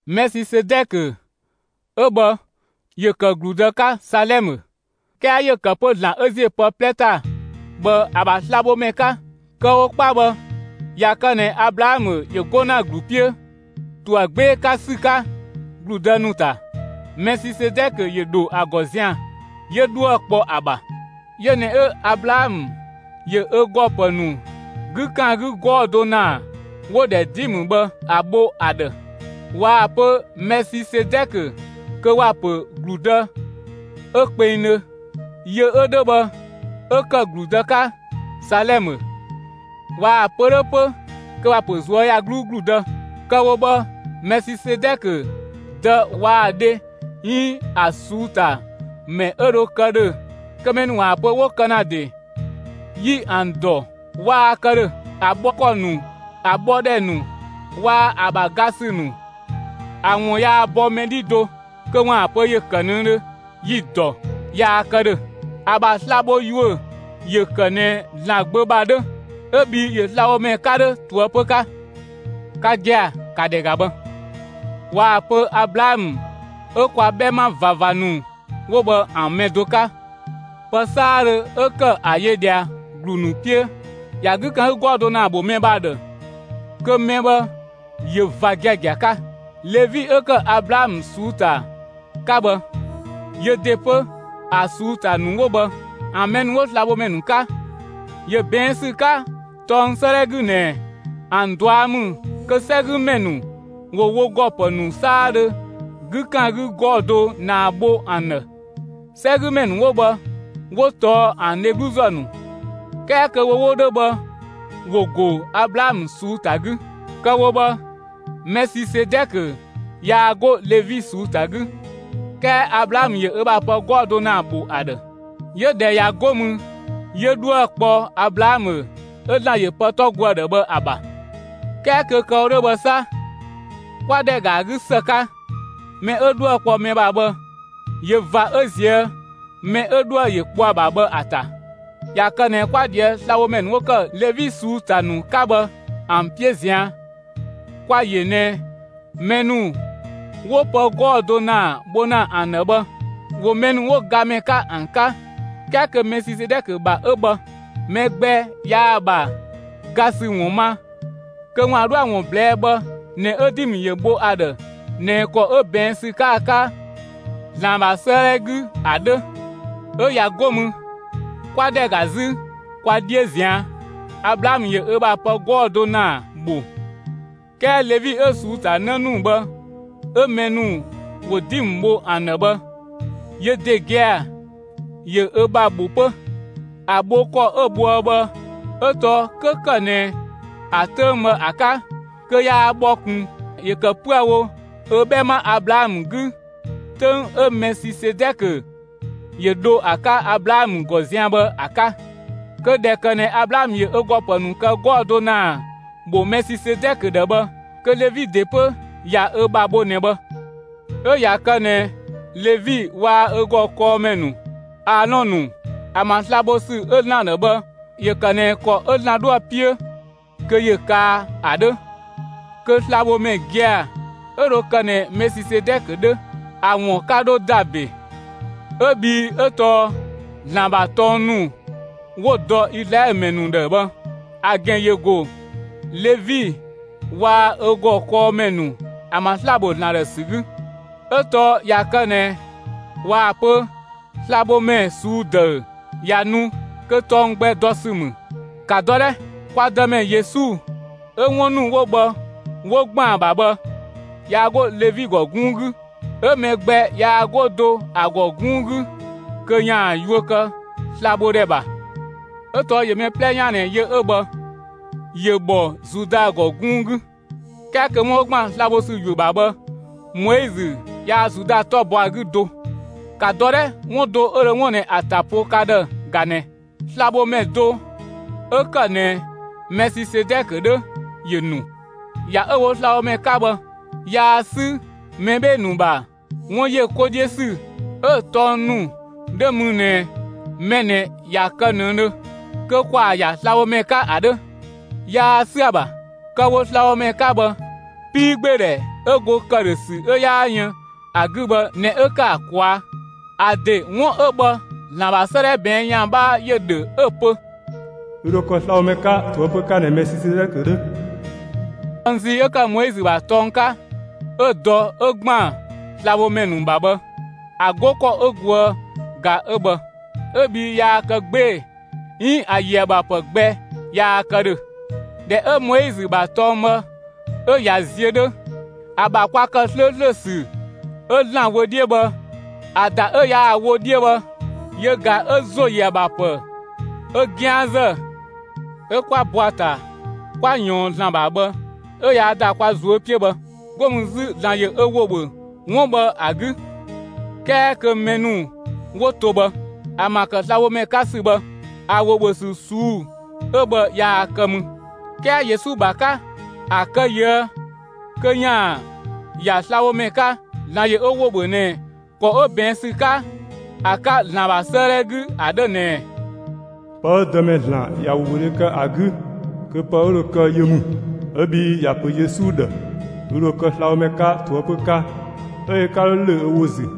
Mɛsisedɛkö 'ö bhë ‑yö kë ‑gludë 'ka Salɛmë; 'kɛɛ ‑yö ‑kë 'pö ‑Zlan 'ö ‑ziö pë 'plɛ ‑ta bhë ‑a ‑bha slabhomɛ 'ka. Kë‑ wo 'kpa bhë, ꞊ya kë ꞊nɛ Ablaamö ‑yö 'go ‑na ‑glu 'piö ‑to ‑a 'gbee‑ ‑sü 'ka ‑gludë ‑nu ‑ta, Mɛsisedɛkö ‑yö ‑dho ‑a ‑gɔ zian‑ 'yö 'dhuë‑ kpɔ ‑a ‑bha. Yö ꞊nɛ 'ö Ablaamö ‑yö ö ‑gɔ ‑pë ‑nu 'gü ‑kan 'gü 'gɔɔ‑ do ‑naa 'wo‑ ‑dhɛ dimë bhë ‑a bho ‑a ‑dhë. ꞊Waa‑ pö Mɛsisedɛkö, kö ‑wa ‑pö ‑gludë 'ö kpengdhö, yö 'ö 'dhö bhë, 'ö ‑kë ‑gludë 'ka Salɛmë; ꞊waa‑ pö 'dhö 'pö kö ‑wa ‑pö ꞊zuöyagluu ‑gludë. Kë‑ wo bhë, Mɛsisedɛkö dë waa‑ dhe 'iin ‑a ꞊suu'‑ ‑ta ‑mɛ 'ö dho kë ‑dhö kö mɛ ‑nu ‑waan pö 'wo kë ‑na ‑de, yi ‑an ‑dɔ waa kë ‑dhö. ‑A bhɔ ‑kɔ ‑nu, ‑a bhɔ ‑dhɛ ‑nu waa‑ ‑a ‑bha ga ‑sü ‑nu ‑an ‑wun yaa bɔ mɛ 'dhi do kö ‑waan pö ‑yö ‑kë ꞊nëdhö, yi‑ ‑dɔ, yaa kë ‑dhö. ‑A ‑bha sla‑ bho ‑yuö ‑yö ‑kë ꞊nɛ ‑Zlan Gbö ‑bha 'dhö; 'ö bhii ‑yö slabhomɛ 'ka 'dhö ꞊toëpö 'ka. Ka gia‑, ‑ka ‑dhɛ ‑ga bhë! ꞊Waa‑ pö Ablaamö 'ö kwa 'bhɛma ꞊vava ‑nu 'wo bhë ‑a mɛ do 'ka, pë 'saadhö 'ö ‑kë ‑a yö ꞊dhia ‑glu ‑nu 'piö ‑ya 'gü ‑kan 'gü 'gɔɔ‑ do ‑naa ‑bho mɛ bhë ‑a ‑dhë, kö mɛ bhë ‑yö ꞊va giagia 'ka. Levi 'ö ‑kë Ablaamö ꞊suu'‑ ‑ta 'ka bhë, ‑yö ‑de 'pö ‑a ꞊suu'‑ ‑ta ‑nu 'wo bhë, ‑an mɛ ‑nu 'wo slabhomɛ ‑nu 'ka, ‑yö ꞊bɛɛn' ‑sü 'ka tɔng 'sëëdhɛ 'gü ꞊nɛ ‑an ꞊dua' ‑mü kö 'sɛgümɛ ‑nu ‑wo wo ‑gɔ ‑pë ‑nu 'saadhö 'gü ‑kan 'gü 'gɔɔ‑ do ‑naa bho ‑an ‑dhë. 'Sɛgümɛ ‑nu 'wo bhë 'wo tɔɔ ‑an dhegluzë ‑nu 'kɛɛ kö wo 'wo 'dhö bhë ‑wo ‑go Ablaamö ꞊suu'‑ ‑ta 'gü. Kë‑ wo bhë, Mɛsisedɛkö yaa 'go Levi ꞊suu'‑ ‑ta 'gü 'kɛɛ Ablaamö ‑yö ö ‑bha pë 'gɔɔ‑ do ‑naa ‑bho ‑a ‑dhë, 'yö ‑dhɛ ‑ya, 'go mü 'yö 'dhuë‑ kpɔ Ablaamö 'ö ‑Zlan ‑yö pë 'tɔ go ‑a ‑dhë bhë ‑a ‑bha. 'Kɛɛ kö kë‑ wo 'dhö bhë 'sa, 'kwa ‑dhɛ ‑ga ‑a 'gü ‑së 'ka, mɛ 'ö 'dhuë‑ kpɔ mɛ ‑bha bhë ‑yö ꞊va 'ö ꞊zië' mɛ 'ö 'dhuë‑ ‑yö kpɔ ‑a ‑bha bhë ‑a ‑ta. ꞊Ya kë ꞊nɛ 'kwa ꞊dhië'‑ slabhomɛ ‑nu 'wo ‑kë Levi ꞊suu'‑ ‑ta ‑nu 'ka bhë ‑an 'piö ꞊zian', kwa‑ yö ꞊nɛ mɛ ‑nu 'wo pë 'gɔɔ‑ do ‑naa bho ‑na ‑an ‑dhë bhë, ‑wo mɛ ‑nu 'wo gamɛ 'ka ‑an 'ka, 'kɛɛ kö Mɛsisedɛkö ‑bha 'ö bhë, mɛ gbɛ yaa‑ ‑bha ga ‑sü ‑wun ma kö ‑waan 'dhoë‑ ‑wun ꞊blɛɛ'‑ bhë ꞊nɛ 'ö dimë ‑yö ‑bho ‑a ‑dhë ꞊nɛ ‑kɔ 'ö ꞊bɛɛn' ‑sü 'ka ‑a 'ka ‑Zlan ‑bha 'sëëdhɛ 'gü ‑a 'dhö. 'Ö ꞊ya 'go mü, 'kwa ‑dhɛ ‑ga 'zü kwa 'dhiö ꞊zian', Ablaamö ‑yö ö ‑bha pë 'gɔɔ‑ do ‑naa ‑bho; 'kɛɛ Levi 'ö‑ ꞊suu'‑ ‑ta 'në ‑nu bhë 'ö mɛ ‑nu ‑wo dimë bho ‑an ‑dhë bhë, yö ‑de gia‑, ‑yö ö ‑bha ‑bho 'pö. ‑A bho ‑kɔ 'ö bhoë bhë 'ö tɔɔ 'kö ‑kë ꞊nɛ ‑a 'töng bhë ‑a 'ka, kö yaa bhɔ ꞊kun, ‑yö ‑kë 'püë‑ wo ö 'bhɛma Ablaamö 'gü 'töng 'ö Mɛsisedɛkö ‑yö dho ‑a 'ka Ablaamö ‑gɔ zian bhë ‑a 'ka. (Kö ꞊dhɛ ‑kë ꞊nɛ Ablaamö ‑yö ö ‑gɔ ‑pë ‑nu kë 'gɔɔ‑ do ‑naa ‑bho Mɛsisedɛkö ‑dhë bhë, kö Levi ‑de 'pö ꞊ya ö ‑bha bho ꞊nɛ bhë). 'Ö ꞊ya kë ꞊nɛ Levi waa‑ ö ‑gɔ kɔɔmɛ ‑nu Aalɔn ‑nu ‑an ‑bha sla‑ bho ‑sü 'ö ‑Zlan ‑dhë bhë ‑yö ‑kë ꞊nɛ ‑kɔ 'ö ‑Zlan 'dhoë‑ 'piö kö ‑yö kaa ‑a 'dhö, kö slabhomɛ gia‑ 'ö dho kë ꞊nɛ Mɛsisedɛkö 'dhö, ‑a ‑wun 'ka 'dho ‑da ‑be, 'ö bhii 'ö tɔɔ ‑Zlan ‑bha tɔng ‑nu 'wo‑ dɔ Izlaɛlö ‑mɛ ‑nu ‑dhë bhë ‑a ‑gɛn ‑yö ‑go Levi waa‑ ö ‑gɔ kɔɔmɛ ‑nu ‑an ‑bha sla‑ bho ‑Zlan ‑dhë ‑sü 'gü. 'Ö tɔɔ ꞊ya kë ꞊nɛ ꞊waa‑ pö slabhomɛ ꞊suu'‑ ‑dëü ꞊ya nu kö tɔng gbɛ dɔ ‑sü ‑mü; ‑ka dɔ 'dhɛ! Kwa Dëmɛ Yesu 'ö 'wun ‑nu 'wo bhë 'wo ‑gban ‑a ‑bha bhë, yaa 'go Levi ‑gɔ 'gunng 'gü, 'ö mɛ gbɛ yaa 'go do ‑a ‑gɔ 'gunng 'gü kö ‑yaan yuö kë slabhodhɛ ‑bha; 'ö tɔɔ ‑yö mɛ 'plɛ 'yaan ꞊nɛ yö 'ö bhë, ‑yö ‑bhɔ Zuda ‑gɔ 'gunng 'gü. 'Kɛɛ kö 'wun 'ö ‑gban sla‑ bho ‑sü ‑yuö ‑bha bhë, Moizö yaa Zuda 'tɔ bɔ ‑a 'gü do. ‑Ka dɔ 'dhɛ! 'Wun do 'ö dho 'wun ꞊nɛ ‑a ‑ta po ka ‑dhë ꞊ga ꞊nɛ: Slabhomɛ do 'ö ‑kë ꞊nɛ Mɛsisedɛkö 'dhö ‑yö ‑nu. ‑Ya 'ö‑ wo slabhomɛ 'ka bhë, yaa 'sü mɛ 'bhee‑ ‑nu ‑bha 'wun ‑yö 'ko 'dhiö ‑sü 'ö‑ tɔng ‑nu 'dhö mü ꞊nɛ mɛ ꞊nɛ ꞊ya kë ꞊nëdhö, kö ‑kwaa ‑ya slabhomɛ 'ka ‑a 'dhö, yaa 'sü ‑a ‑bha; kë‑ wo slabhomɛ 'ka bhë, 'piigbeedhɛ 'ö go ‑këdhösü 'ö 'yaa yën ‑a 'gü bhë ꞊nɛ 'ö ‑kë ‑a ꞊kwaa'. ‑A ‑de 'wun 'ö bhë ‑Zlan ‑bha 'sëëdhɛ ꞊bɛɛn' ‑yan 'bhaa ‑yö ‑dhö 'ö‑ pö: Ü ‑dho kë slabhomɛ 'ka ꞊toëpö 'ka ꞊nɛ Mɛsisedɛkö 'dhö. Tɔng zii 'ö ‑kë Moizö ‑bha tɔng 'ka 'ö dɔ 'ö ‑gban slabhomɛ ‑nu ‑bha bhë, ‑a 'go ‑kɔ 'ö goë ꞊ga 'ö bhë 'ö bhii yaa kë 'gbee‑ 'iin ‑a ‑yö ‑a ‑bha ‑pë gbɛ yaa kë ‑dhö. ꞊Dhɛ 'ö Moizö ‑bha tɔng bhë 'ö ꞊ya ziö 'dhö, ‑a ‑bha kwa ‑kë 'slööslö ‑sü 'ö ‑Zlan wö 'dhiö bhë ‑a ‑da 'ö yaa‑ wo 'dhiö bhë, yö ꞊ga 'ö ‑zo ‑yö ‑a ‑bha ‑pë 'ö 'gianzë 'ö 'kwa bɔ ‑a ‑ta 'kwa ꞊yɔɔn ‑Zlan ‑bha bhë 'ö ꞊yaa‑ ‑da kwa ꞊zuö' 'piö bhë. 'Go mü 'zü ‑Zlan ‑yö ö ‑wo ‑bhö 'wun bhë ‑a 'gü. 'Kɛɛ kö mɛ ‑nu 'wo to bhë, ‑an ‑bha ‑kë slabhomɛ 'ka ‑sü bhë, ‑a ‑wo ‑bhö ‑sü ꞊suu'‑ 'ö bhë yaa kë mü. 'Kɛɛ Yesu ‑bha 'ka, ‑a kë ꞊yië' kö ‑yaan ‑ya slabhomɛ 'ka, ‑Zlan ‑yö ö ‑wo ‑bhö ꞊nɛ ‑kɔ 'ö ꞊bɛɛn' ‑sü 'ka ‑a 'ka ‑Zlan ‑bha 'sëëdhɛ 'gü ‑a 'dhö ꞊nɛɛ: Pë 'ö Dëmɛ (‑Zlan) ꞊ya ‑wobhödhe kë ‑a 'gü kö pë 'ö‑ ‑de dho kë yö ‑mü 'ö bhii ‑ya ‑pö Yesu ‑dhë: «Ü ‑dho kë slabhomɛ 'ka ꞊toëpö 'ka»; 'ö yö 'ka 'dho ‑lö ö ‑wo ‑zü.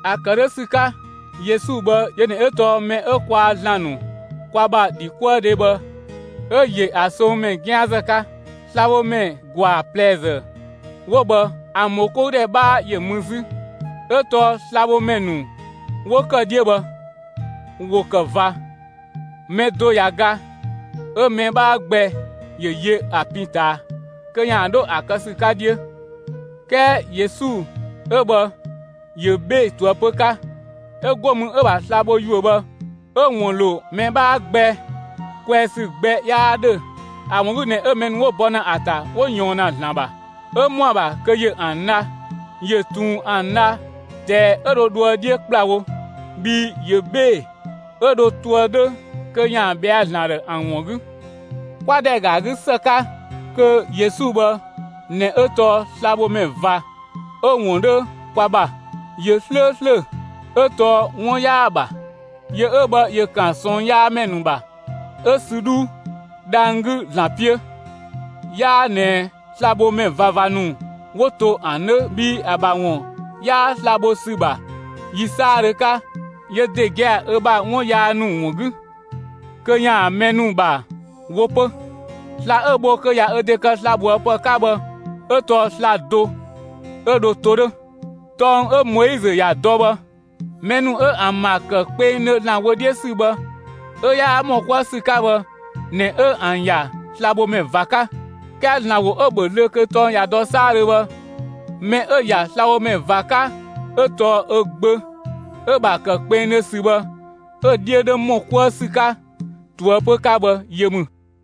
‑A ‑kë 'dhö ‑sü 'ka, Yesu bhë yö ꞊nɛ 'ö tɔɔ mɛ 'ö kwaa‑ ‑Zlan ‑nu kwa ‑bha ‑dhikuëdhe bhë 'ö ‑yö ‑a songmɛ 'gianzë 'ka. Slabhomɛ ‑gwaa ꞊plɛzë 'wo bhë ‑an ‑bhokoudhɛ 'bhaa ‑yö mü 'zü. 'Ö tɔɔ slabhomɛ ‑nu 'wo ‑kë 'dhiö bhë, ‑wo ‑kë ꞊va; mɛ do ꞊ya ga, 'ö‑ mɛ 'bhaa gbɛ ‑yö yö ‑a pin ꞊taa kö ‑yaan 'dho ‑a kë ‑sü 'ka 'dhiö. 'Kɛɛ Yesu 'ö bhë ‑yö 'bhee‑ ꞊toëpö 'ka; 'ö 'go mü 'ö‑ ‑bha sla‑ bho ‑yuö bhë 'ö‑ ‑wun ‑lo mɛ 'bhaa gbɛ kwɛɛ ‑sü gbɛ 'yaa 'dhö. ‑A ‑wun 'gü ꞊nɛ 'ö mɛ ‑nu 'wo bɔ ‑na ‑a ‑ta 'wo ꞊yɔɔn ‑na ‑Zlan ‑bha, 'ö ‑mɔa ‑bha kö ‑yö ‑an dha; ‑yö ꞊tun ‑an dha ꞊dɛɛ 'ö dho dhoë 'dhiö ‑kplawo, bhii ‑yö 'bhee‑, 'ö dhö toë 'dhö kö ‑yaan ‑bhɛa ‑Zlan ‑dhë ‑an ‑wun 'gü. 'Kwa ‑dhɛ ‑ga ‑a 'gü ‑së 'ka, kö Yesu bhë ꞊nɛ 'ö tɔɔ slabhomɛ ꞊va 'ö‑ ‑wun 'dhö kwa ‑bha. ‑Yö 'slööslö, 'ö tɔɔ 'wun 'yaa‑ ‑bha. Yö 'ö bhë ‑yö ‑kan ꞊sɔɔnyaamɛ ‑nu ‑bha, 'ö sü 'dhuu, dhang‑ 'gü ‑Zlan 'piö. 'Yaa ꞊nɛ slabhomɛ ꞊vava ‑nu 'wo to ‑an 'dhö bhii ‑a ‑bha ‑wun 'yaa sla‑ ‑bho ‑sü ‑bha yi 'saadhö 'ka yö ‑de gia‑ ö ‑bha 'wun yaa ‑nu ‑wun 'gü, kö ‑yaan mɛ ‑nu ‑bha wo 'pö. Sla‑ 'ö‑ bho kö ꞊ya ö ‑de kë slabhoëpë 'ka bhë 'ö tɔɔ sla‑ do 'ö dho to 'dhö. Tɔng 'ö Moizö ‑ya dɔ bhë, mɛ ‑nu 'ö ‑an ‑bha ‑kë kpengdhö ‑Zlan wö 'dhiö ‑sü bhë 'ö 'yaa ‑mɔ 'kuë ‑sü 'ka bhë ꞊nɛ 'ö ‑an ‑ya slabhomɛ ꞊va 'ka. 'Kɛɛ ‑Zlan ‑wo 'ö‑ ‑bhö zlöö kö tɔng ꞊ya dɔ 'saadhö bhë, mɛ 'ö‑ ‑ya slabhomɛ ꞊va 'ka 'ö tɔɔ ö Gbö 'ö‑ ‑bha ‑kë kpengdhö ‑sü bhë 'ö‑ 'dhiö 'dhö ‑mɔ 'kuë ‑sü 'ka ꞊toëpö 'ka bhë, yö ‑mü.